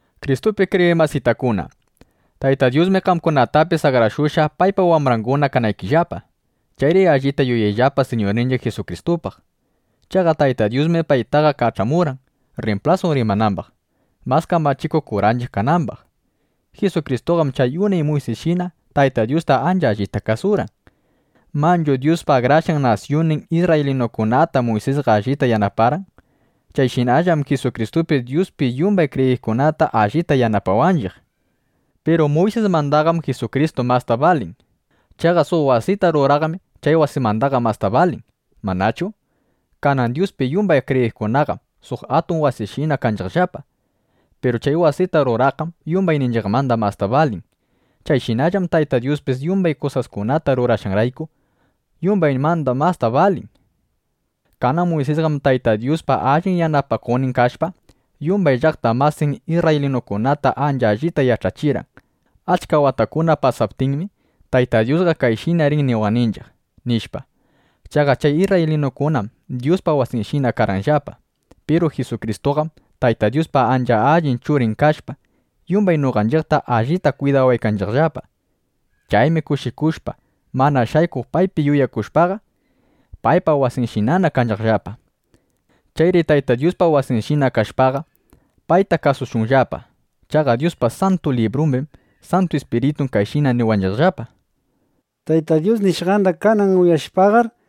Kristupi kriyiq masitakuna, Tayta Dyusmi qamkunatapis akrashushqa, paypa wambranguna kanaykillapa. Chayri allita yuyayllapa Siñurninchiq Jisukristupaq. Chaqa Taytan Dyusmi paytaqa kach'amurqan, rrimplasun rimanambaq, mas kamachikuq kuranchiq kanambaq. Jisukristuqam chay unay Muysisshina Tayta Dyusta ancha allita kasurqan. Manchu Dyuspa akrashqan nasyunnin isrraylinukunata Muysisqa allita yanaparqan. Chayshinallam Jisukristupis Dyuspi yumbay kriyiqkunata allita yanapawanchiq. Piru Muysismandaqam Jisukristu masta balin. Chaqa suq wasita ruraqmi chay wasimandaqa masta balin, ¿manachu? Kanan Dyuspi yumbay kriyiqkunaqam suq atun wasishina kanchiqllapa. Piru chay wasita ruraqqam yumbayninchiqmanda masta balin. Chayshinallam Tayta Dyuspis yumbay kusaskunata rurashqanrayku, yumbaymanda masta balin. Kanan Muysisqam Tayta Dyuspa allin yanapakuqnin kashpa, yumbay llaqta masin isrraylinukunata ancha allita yach'achirqan: “Achka watakuna pasaptinmi, Tayta Dyusqa kayshina rin niwaqninchiq”, nishpa. Chaqa chay isrraylinukunam Dyuspa wasinshina karqanllapa. Piru Jisukristuqam, Tayta Dyuspa ancha allin Churin kashpa, yumbay noqanchiqta allita kwidawanchiqllapa. Chaymi kushikushpa, mana shaykuq paypi yuyakushpaqa, paypa wasinshinana kanchiqllapa. Chayri Tayta Dyuspa wasinshina kashpaqa, payta kasushunllapa. Chaqa Dyuspa Santu Librumbim Santu Ispiritun kayshina niwanchiqllapa: Tayta Dyus nishqanda kanan uyashpaqar,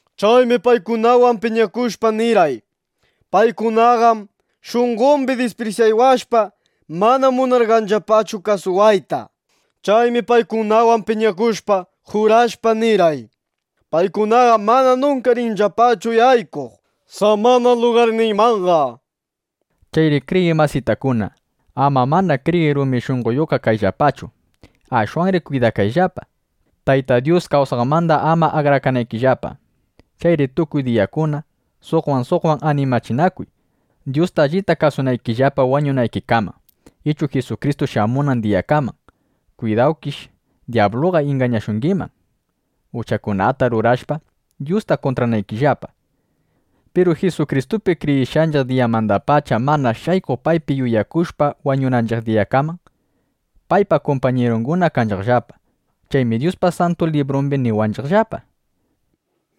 Chaymi paykunawan piñakushpa, nirqay: ‘Paykunaqam shunqombi disprisyawashpa, mana munanllapachu kasuwayta’, nishpa. Chaymi paykunawan piñakushpa, jurashpa, nirqay: ‘Paykunaqam mana nunka rinllapachu yaykuq samana lugarniymanqa’”, nishpa. Chayri kriyiq masitakuna, ama mana kriyiq rumi shunqoyuqqa kayllapachu. Ashwanri kwidakayllapa, Tayta Dyus kawsaqmanda ama akrakanaykillapa. Chayri tukuy diyakuna suqwan suqwan animachinakuy, Dyusta allita kasunaykillapa wañunaykikaman, ichu Jisukristu shamunan diyakaman. Kwidawkish, dyabluqa ingañashungiman, uchakunata rurashpa, Dyusta kuntranaykillapa. Piru Jisukristupi kriyishqanchiq diyamandapacha mana shaykuq paypi yuyakushpa wañunanchiq diyakaman, paypa kumpañirunguna kanchiqllapa. Chaymi Dyuspa Santu Librumbi niwanchiqllapa: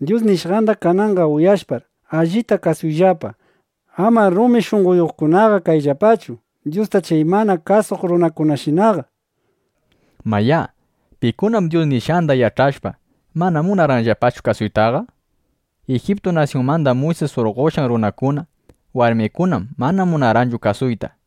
Dyus nishqanda kananqa uyashpar, allita kasuyllapa. Amar rumi shunqoyuqkunaqa kayllapachu, Dyusta chay mana kasuq runakunashinaqa, nishpa. Mayá, ¿pikunam Dyus nishqanda yach'ashpa, mana munarqanllapachu kasuytaqa? Ijiptu nasyunmanda Muysis surqoshqan runakuna, warmikunam mana munarqanchu kasuyta.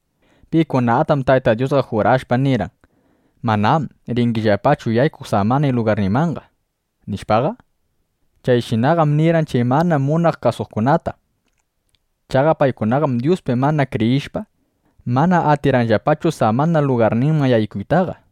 ¿Pikunatam Tayta Dyusqa jurashpa, nirqan: “Manam ringillapachu yaykuq samana lugarniymanqa”, nishpaqa? Chayshinaqam nirqan chay mana munaq kasuqkunata. Chaqa paykunaqam Dyuspi mana kriyishpa, mana atirqanllapachu samana lugarninman yaykuytaqa.